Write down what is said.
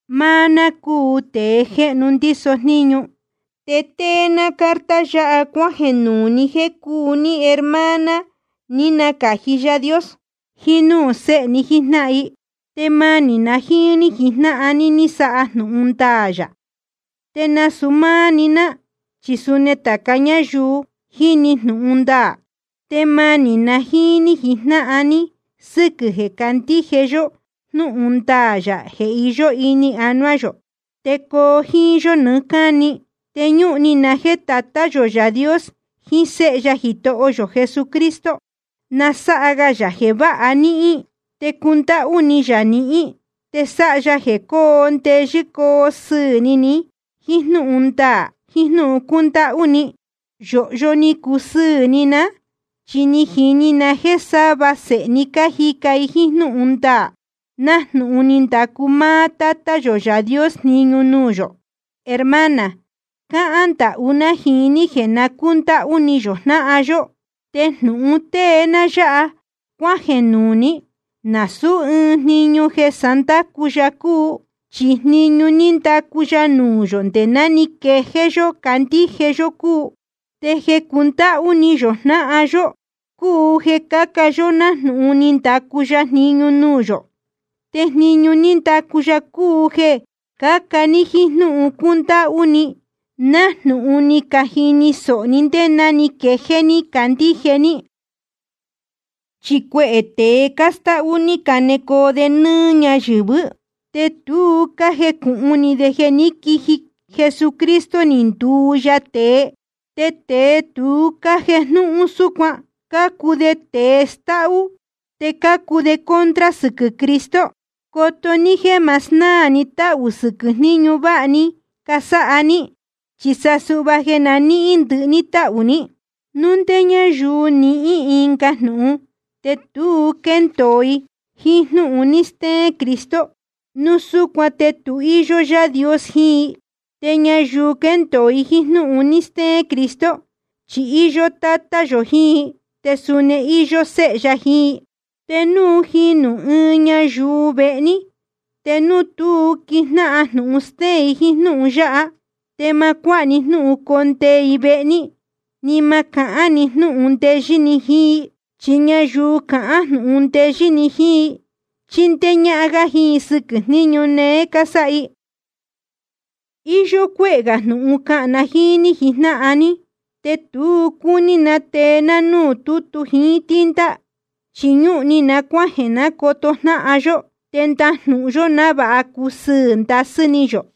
Máá ná cúu tēe jéhnu ndíso jníñu, te tée ná carta yáha cuájeē nuū ni jéē cúu ní hermana ni nacāji Yaā Dios, jiín núū séhe ní jíjnáhan i. Te manī na jíín ní jijnáhan ní sáha jnūhun ndaā yā, te nasūu máá‑ni ná, chi suni tāca ñáyuu jiní jnūhun ndaā. Te manī na jíín ní jijnáhan ní sɨ́quɨ̄ jeē cácandíje yó jnúhun ndaā yā jeē iyó ini anuá yō, te coo jíín yó nɨɨ́ cáni. Te ñúhun ni na jéē Tatá yō Yaā Dios jiín Séhe ya Jitoho yō Jesucristo, na sáha ga yā jeē váha níhín, te cundáhú ni yā nihín, te sáha ya jeē coo ndeyɨ́ coo sɨɨ̄ ni ní, jíín jnúhun ndaā jiín jnúhun cúndáhú ni. Yōhyo ni cusɨɨ̄ ni ná, chi ni jini na jéē sava sēhe ní cájica i jíín jnúhun ndaā, nájnūhun ni ndacu máá Tátá yō Yaā Dios jniñu nuū yō. Hermana, cáhán ndahú ná jiín ní jeē na cúndáhú ni yō jnáhan yó. Te jnūhun tée ná yáha cuájeē nuū ní, nasūú ɨɨn jniñu jéé sá ndácu ya cúu, chi jniñu ní ndacu ya nuū yō nde ná ni quejéé yó candíje yó cúu. Te jeē cundáhú ni yō jnáhan yó cúu jeē caca yó nájnūhun ni ndacu ya jniñu nuū yō. Te jniñu ní ndacu ya cúu jeē caca ní jíín jnúhun cúndáhú ni, nájnūhun ni cajini sōho ní ndé ná ni quejéé ní candíje ní. Chi cuehē tēe cástáhú ni canecoo de nɨ́ɨ́ ñáyɨ̄vɨ́, te tu cájejnúhún de jeē ní quiji Jesucristo ni nduu ya tēe. Te tēe tu cájejnúhún súcuan, cácuu de tēe stáhú, te cácuu de contra sɨquɨ̄ Cristo. Coto ní jéē ma snáā ni táhū sɨquɨ̄ jniñu váha ni casáha ní, chi sa suhva jeē na níhín ni ndɨhɨ tahū ní. Núu ndé ñáyuu jnɨ́ɨ ɨnga jnūhun, te tu quéndōo i jíín jnúhun ni steén Cristo, núu súcuan te tu íyó Yaā Dios jiín i. Te ñayuu quéndōo jíín jnúhun ni steén Cristo, chi íyó Tátá yō jiín i, te suni íyó Séhe ya jiín i. Te núu jinū ɨɨn ñayuu vehe ní, te núu tu quíjnáhan jnūhun stéén i jíín jnúhun yáha, te ma cuáha ní jnúhun condee i vehe ní, ni ma cahán ni jnúhun ndeyɨ́ ni jiín i. Chi ñayuu cahán jnūhun ndeyɨ́ ni jiín i, chíndéé ñájnáhan jíín i sɨquɨ̄ jníñu néé cásáha i. Iyó cuéhē gā jnūhun cahān na jíín ní jijnáhan ní, te tu cúní na tee ná núū tútu jiín tinta. Chi ñúhun ni na cuájeē ná coto jnáhan yó, te ndajnūhun yó, návāha cusɨɨ̄ ndasɨ́ ni yō.